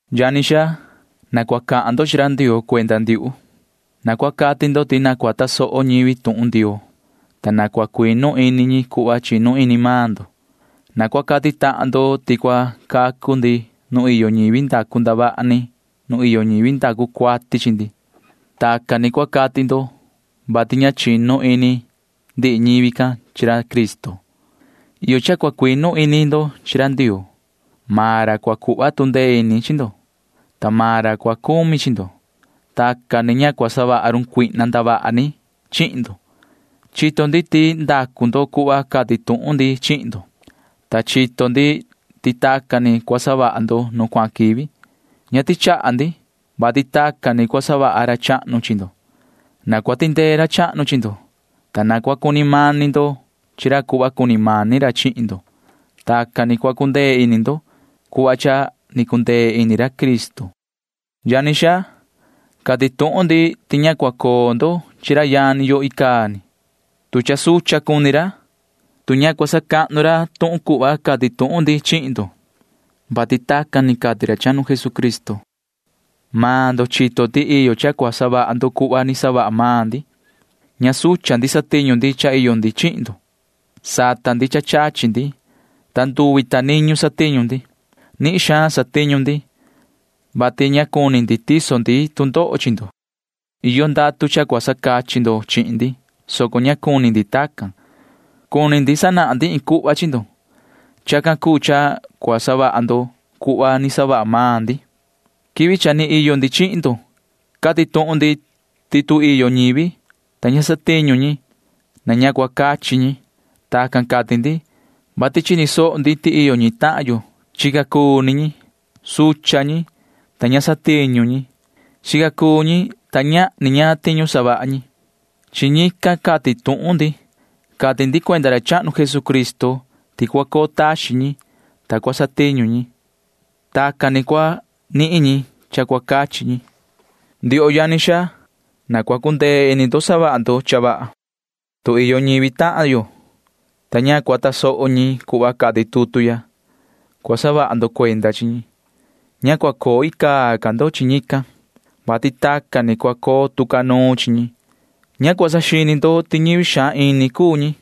Yani xaa, na cua cahan ndo chi ra Ndioo cuenda ndiuhu. Na cua cati ndo ti na cua tasoho ñivi tuhun Ndioo, ta na cua cuinu ini ñi cuhva chinu ini maan ndo. Na cua cati tahan ndo ti cua cacu ndi nu iyo ñivi ndacu ndavaha ni nu iyo ñivi ndacu cuati chi ndi. Tacan ni cua cati ndo, vati ña chinu ini ndihi ñivi can chi ra Cristo. Iyo cha cua cuinu ini ndo chi ra Ndioo. Maan ra cua cuhva tu ndee ini chi ndo, ta maan ra cua cumi chi ndo. Tacan ni ña cua savaha run cuihna ndavaha ni chihin ndo. Chito ndi ti ndacu ndo cuhva cati tuhun ndi chihin ndo, ta chito ndi ti tacan ni cua savaha ndo nu cuahan quivi. Ña tichaha ndi, vati tacan ni cua savaha ra chahnu chi ndo. Na cua tindee ra chahnu chi ndo, ta cua cuni mani ndo chi ra cuhva cuni mani ra chihin ndo. Tacan ni cua cundee ini ndo cuhva cha ni cundee ini ra Cristo. Yani xaa, cati tuhun ndi ti ña cua coo ndo chi ra yani yo icaa ni, tu cha sucha cuni ra, tu ña cua sacahnu ra tuhun cuhva cati tuhun ndi chihin ndo, vati tacan ni cati ra chahnu Jesucristo. Maan ndo chito ti iyo cha cua savaha ndo cuhva ni savaha maan ndi. Ña sucha ndi satiñu ndi cha iyo ndi chihin ndo. Sata ndi cha chachi ndi, ta nduvi ta niñu satiñu ndi. Nihin xaan satiñu ndi, vati ña cuni ndi tiso ndi tu ndoho chi ndo. Iyo ndatu cha cua sacachi ndo chihin ndi, soco ña cuni ndi tacan. Cuni sanahan ndi iin cuhva chi ndo. Chacan cuu cha cua cuu savaha ndo cuhva ni savaha maan ndi. Quivi cha ni iyo ndi chihin ndo cati tuhun ndi. Cati tuhun ndi ti tu iyo ñivi, ta ña cua satiñu ñi, ña cua cuu cachi ñi. Tacan cati ndi, vati chini soho ndi ti iyo ñi tahan yo chica cuu ni ñi. Sucha cuni ñi, ta ña satiñu ñi. Chica cuu ni ñi, ta ñahni ñaan tiñu savaha ñi. Chi ñican cati tuhun ndi. Cati ndi cuenda ra chahnu Jesucristo ti cua coo taxin ñi, ta cua satiñu ñi. Tacan ni cua nihin ñi cha cua cachi ñi. Ndioho yani xaa, na cua cundee ini ndo savaha ndo cha vaha. Tu iyo ñivi tahan yo, ta ña cua tasoho ñi cuhva cati tutu ya, cua saha ndo cuenda chi ñi. Ña cua coo icaa ni ca ndo chi ñican, vati tacan ni cua coo tu ca nuun chi ñi. Ña cua saxini ndo ti ñivi xaan ini cuu ñi,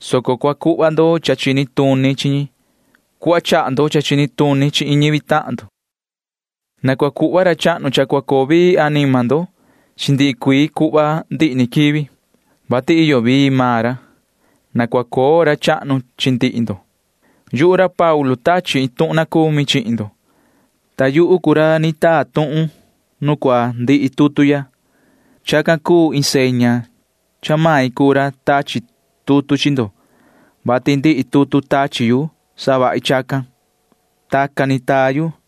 soco cua cuhva ndo cha chini tuni chi ñi cuhva chaha ndo cha chini tuni chihin iin ñivi tahan ndo. Na cua cuhva ra chahnu cha cua coo vii anima ndo chi ndihi cuii cuhva ndihi ni quivi, vati iyo vii maan ra. Na cua coo ra chahnu chi ndihi ndo. Yuhu ra Paulu tachi iin tuhun na cumi chihin ndo, ta yuhu cuu ra ni taa tuhun nu cua ndihi tutu ya. Chacan cuu iin seña cha main cuu ra tachi tutu chi ndo, vati ndihi tutu tachi yu savahi chacan. Tacan ni taa yu.